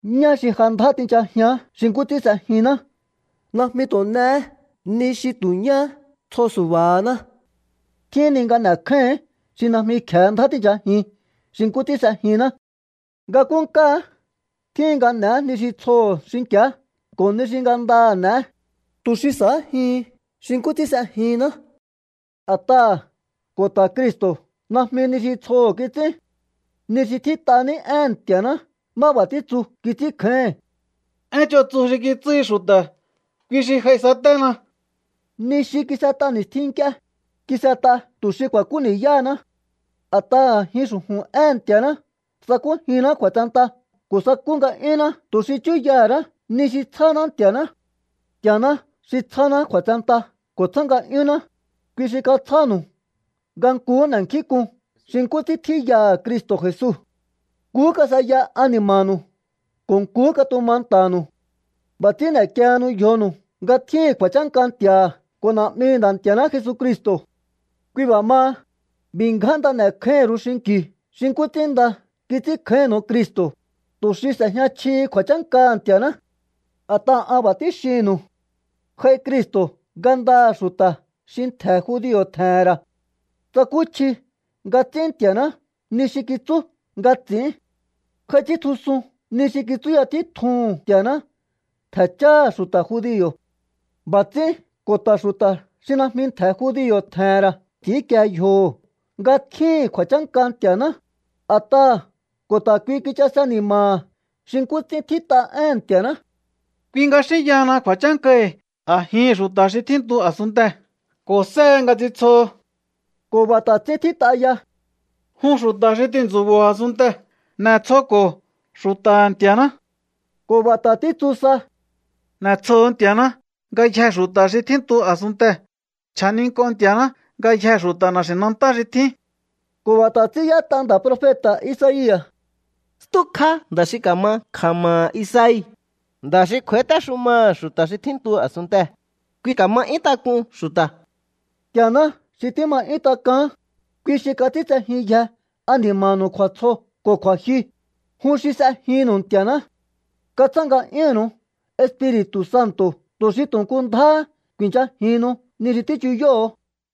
Ñá xi ja ndjá tinchajián xi nkú ts'ín s'ejinná najmi tu̱ n'e̱é ni xi tu̱ ñá tsjo su̱ba̱háná. Tjíhin ni nga n'e̱kjáíhi̱ín xi najmi kje̱e ndjá tíi̱nchajin xi nkú ts'ín s'ejinná. Nga nkúnkáá tjíhin nga n'e̱é ni xi tsjoho̱ xinki̱á ko̱ ni xi ngandaha̱ n'e̱é, tu̱ xi sa̱ájihin xi nkú ts'ín s'ejinná. A̱t'aha̱ ko̱ ta̱ Cristo̱ najmi ni xi tsjoho̱ kits'ín. Ni xi tjít'a ní éhe̱n Nti̱a̱ná má b'a̱ títsu kits'ínkjáíhi̱n: “Én ch'on tsu xi kitsúhi xu̱ta̱, kui xi j'aisaténa.” Ni xi kis'et'a ni̱stjin nk'ie, kis'et'a tu̱ xi ku̱a̱kú ni̱yáhaná. A̱t'aha̱ a̱jin xu̱ju̱n éhe̱n Nti̱a̱ná sakújinná kju̱a̱tsenta ko̱ sakú nga̱'yúnná tu̱ xi chúyaha̱ ra̱á ni xi tsjáná Nti̱a̱ná. Nti̱a̱ná xi tsjáná kju̱a̱tsenta ko̱ tsjá nga'yúnná, kui xi katsjánu̱u nga nkuhú n'e̱nkjínk'un xi nkú ts'ín tjíyaha̱ Cristo̱ Jesu. Nkuhú kas'eya ani̱ma̱nu̱u ko̱ nkuhú katuma nta̱nu̱u. B'a̱ ts'ín n'e̱kiehenu yjonu̱u nga tjíhi̱n kju̱a̱chánka Nti̱a̱ha̱ ko̱ Na̱'mihi̱ Nda̱ Nti̱a̱ná Jesucristo̱. Kui b'a̱ maha, b'i̱ ngján nda n'e̱kjáíhi̱n ru̱u xinki̱u xi nkú ts'ín nda kits'ínkjáínnu̱u Cristo̱, tu̱ xi s'e̱jña chjihi kju̱a̱chánkaha̱ Nti̱a̱ná. A̱t'aha̱ an b'a̱ tíxinnu̱u. J'ai Cristo̱ ngandaha̱ xu̱ta̱ xi ntje̱ judio̱ tje̱he̱n ra̱. Tsakúchji nga ts'ín Nti̱a̱ná ni xi kitsú nga ts'i̱ín. J'ai ts'íntjusun ni xi kitsúya títjuhu̱n Nti̱a̱ná ntje̱ cháha̱ xu̱ta̱ judio̱. B'a̱ ts'ín ko̱ ta̱ xu̱ta̱ xi najmi ntje̱ judio̱ tje̱he̱n ra̱ ts'i̱ínkie yjoho̱ nga tjíhi̱n kju̱a̱chánka Nti̱a̱ná, a̱t'aha̱ ko̱ ta̱ kui kichase ni̱ma̱ha̱ xi nkú ts'ín tjít'a éhe̱n Nti̱a̱ná: Kui nga xínyahana kju̱a̱chánkahi̱ a̱jihi̱n xu̱ta̱ xi tjíntu a̱sunntee̱, ko̱ séhe nga ts'intsjoho. Ko̱ b'a̱ ta̱ ts'ín tjít'a ya: Jun xu̱ta̱ xi tintsu̱bo̱o a̱sunntee̱, n'e̱tsjoko̱o xu̱ta̱ha̱ Nti̱a̱ná. Ko̱ b'a̱ ta̱ títsu sa: N'e̱tsjoho̱o Nti̱a̱ná ngayjee̱ xu̱ta̱ xi tjíntu a̱sunntee̱. Cha̱nink'o Nti̱a̱ná ngayjee̱ xu̱ta̱ na̱xi̱nantá xi tjín. Ko̱ b'a̱ ta̱ ts'ín y'ét'a nda̱ profeta̱ Isaia̱: Stjúkjá nda̱ xi ka̱ma kja̱ma̱ha̱ Isai, nda̱ xi kj'u̱a̱ítéxumaha̱ xu̱ta̱ xi tjíntu a̱sunntee̱, kui ka̱ma 'yún tak'un xu̱ta̱. Nti̱a̱ná xi tíma 'yún tak'aán, kui xi kats'íntsejínyje ani̱ma̱nu̱u kju̱a̱tsjo ko̱ kju̱a̱jyu, jun xi s'ejinnu̱u Nti̱a̱ná. Katsjá nga'yúnnu̱u Espiri̱tu̱ Santo̱ tu̱ xi tu̱ nku ndjáhá ku̱i̱nchajihinnu ni xi tíchuyóho̱o.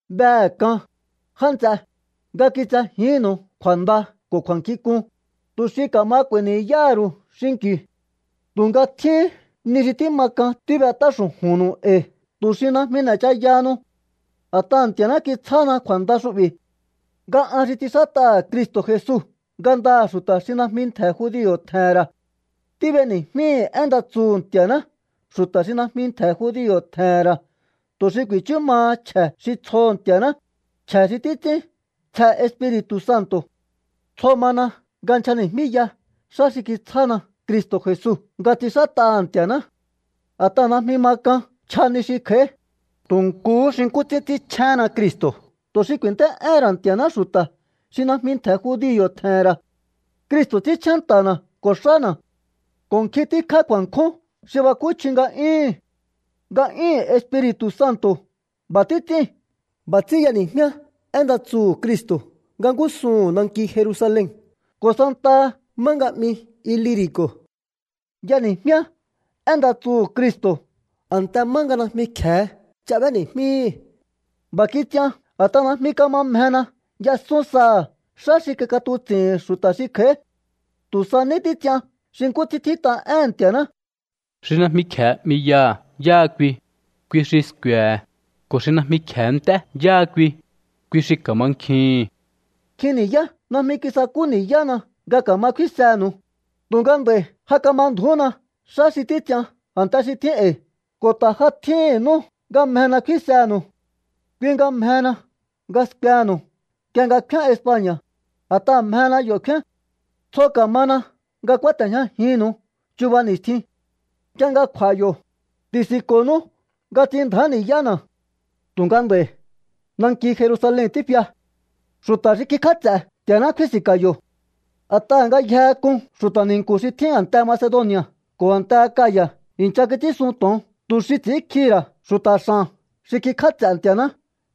Behe̱ k'an, já nts'e, nga kitsejíhi̱nnu̱u kju̱a̱nda ko̱ kju̱a̱nkjink'un, tu̱ xi ka̱ma k'u̱a̱i̱ ni̱yáha̱ ru̱u xinki̱u. Tu̱nga tjíhín ni xi tíma k'an tíb'et'á xu̱ju̱nnu̱u e̱i̱ tu̱ xi najmi n'e̱chayahanu. A̱t'aha̱ Nti̱a̱ná kitsjána kju̱a̱nda xu'bi̱ nga an xi ts'inxát'aha̱ Cristo̱ Jesu ngandaha̱ xu̱ta̱ xi najmi ntje̱ judio̱ tje̱he̱n ra̱. Tíb'eni̱jmíhi̱ én nda tsuhu̱ Nti̱a̱ná xu̱ta̱ xi najmi ntje̱ judio̱ tje̱he̱n ra̱ tu̱ xi ku̱i̱chú maha chje̱ xi tsjoho̱ Ntia̱ná, chje̱ xi títs'ín tsje Espiri̱tu̱ Santo̱. Tsjo mana nga nchjani̱jmíya xá xi kitsjána Cristo̱ Jesu nga ts'inxát'aha̱ Nti̱a̱ná. A̱t'aha̱ najmi ma k'an nchja ni xi kj'a̱í, tu̱ nkuhú xi nkú ts'ín ts'ínchjénna Cristo̱ tu̱ xi ku̱i̱nt'é'éhe̱n ra̱ Nti̱a̱ná xu̱ta̱ xi najmi ntje̱ judio̱ tje̱he̱n ra̱. Cristo̱ ts'ínchjén nta̱na̱ ko̱ xána̱ ko̱ nkjin tíkjá kju̱a̱nkjún xi bakúchji nga'yúhu̱n. Nga'yúhu̱n Espiri̱tu̱ Santo̱ b'a̱ títs'íu̱n. B'a̱ ts'ín jehena nga y'eni̱jmíá én nda tsuhu̱ Cristo̱ nanki Jerusalen ko̱ santaha má nga 'mi Iliri̱co̱. Y'eni̱jmíá én nda tsuhu̱ Cristo̱ a̱nte má nga najmi kje̱e ch'a b'éni̱jmíhi̱. B'a̱ kits'ian a̱t'aha̱ najmi kama mjena y'esún saha̱ xá xi kik'atuts'i̱hi̱n xu̱ta̱ xi kj'a̱í. Tu̱ sa ní títs'ian xi nkú ts'ín tjít'a éhe̱n Nti̱a̱ná: Xi najmi kje̱e 'miyaha̱ yáha kui, kui xi sku̱e̱he̱. Ko̱ xi najmi kje̱e nt'é yáha kui, kui xi ka̱mankjihi̱n. Nkjin ni̱yá najmi kisakú ni̱yána nga ka̱ma kfínsehe̱nu̱u, tu̱nga nd'a̱i̱ ja kama ndju̱úna xá xi títs'ian a̱nte xi tjín e̱i̱ ko̱ ta̱ ja tjíhi̱n nú nga mjena kfínsenu̱u. Kui nga mjehena nga skuenu̱u nk'ie nga kfíán España̱, a̱t'aha̱ mjena yo̱ kfian. Tsjo ka̱mana nga kúáte̱jñajinnu̱u chuba ni̱stjin. Nk'ie nga kj'u̱a̱ yo̱, ti̱si̱nko̱nú nga ts'inndja̱á ni̱yána̱. Tu̱nga nd'a̱i̱ nanki Jerusalen tífia. Xu̱ta̱ xi kikj'áts'e̱ Nti̱a̱ná kfíi̱nsi̱nka̱ yo̱. A̱t'aha̱ ngayjehe k'un xu̱ta̱ ni̱nku̱ xi tjín a̱nte Macedoni̱a̱ ko̱ a̱nte Akaya̱ i̱ncha kits'ínsun to̱on tu̱ xi ts'i̱ínkjihi̱ ra̱ xu̱ta̱ x'a̱n xi kikj'áts'e̱ Nti̱a̱ná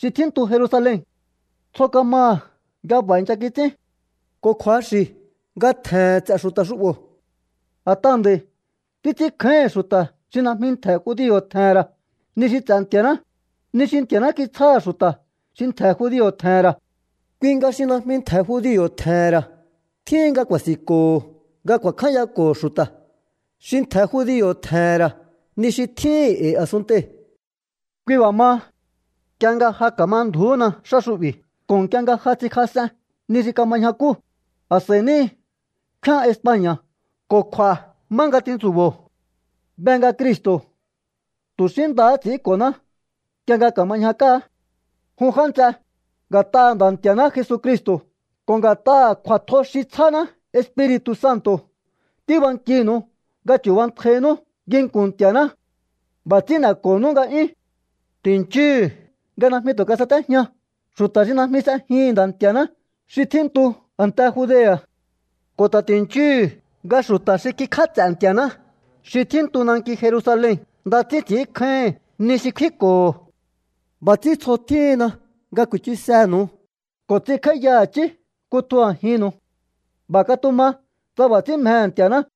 xi tjíntu Jerusalen. Tsjo kamaha̱ nga b'a̱ i̱ncha kits'ín. Ko̱ kju̱axi̱ nga tje̱he̱n ts'e̱ xu̱ta̱ xu'bo̱. A̱t'aha̱ nd'a̱i̱ títs'ínkjáíhi̱n xu̱ta̱ xi najmi ntje̱ judio̱ tje̱he̱n ra̱ ni xi ts'e̱ Nti̱a̱ná, ni xi Nti̱a̱ná kitsjáha̱ xu̱ta̱ xi ntje̱ judio̱ tje̱he̱n ra̱. Kui nga xi najmi ntje̱ judio̱ tje̱he̱n ra̱ tjíhin nga ku̱a̱si̱nko̱ho nga ku̱a̱kjányako̱ xu̱ta̱ xi ntje̱ judio̱ tje̱he̱n ra̱ ni xi tjíhi̱n e̱i̱ a̱sunntei̱. Kui b'a̱ maha, nk'ie nga ja ka̱ma ndju̱úhuna xá xu'bi̱ ko̱ nk'ie nga ja ts'inkjas'en ni xi kama ñjakúu̱, a̱s'a̱íhí ní kfíán España̱ ko̱ kj'u̱a̱ má nga tintsu̱bo̱o. Be nga Cristo̱ tu̱ xí ndahá ts'i̱ínko̱ná nk'ie nga ka̱ma ñjakáá. Jun já nts'e, nga̱t'aha̱ Nda̱ Nti̱a̱ná Jesucristo̱ ko̱ nga̱t'aha̱ kju̱a̱tjo xi tsjáná Espiri̱tu̱ Santo̱ tíbankinu̱u nga chu̱bantjainú nginku̱n Nti̱a̱ná. B'a̱ ts'ín n'e̱ko̱honú nga'yún. Ti̱nchíhu̱u nga najmi tu̱ kasatéjña xu̱ta̱ xi najmi s'ejihi̱n Nda̱ Nti̱a̱ná xi tjíntu a̱nte Judea̱. Ko̱ ta̱ ti̱nchíhu̱u nga xu̱ta̱ xi kikj'áts'e̱ Nti̱a̱ná xi tjíntu nanki Jerusalen nda ts'ín ts'i̱ínkjáíhi̱n ni xi kfínko̱ho̱. B'a̱ ts'ín tsjo tjíhinna nga ku̱i̱chusenu̱u ko̱ ts'inkj'áíya i̱chí kutju a̱jinnu̱u. B'a̱ katuma tsa b'a̱ ts'ín mjehe̱ Nti̱a̱ná.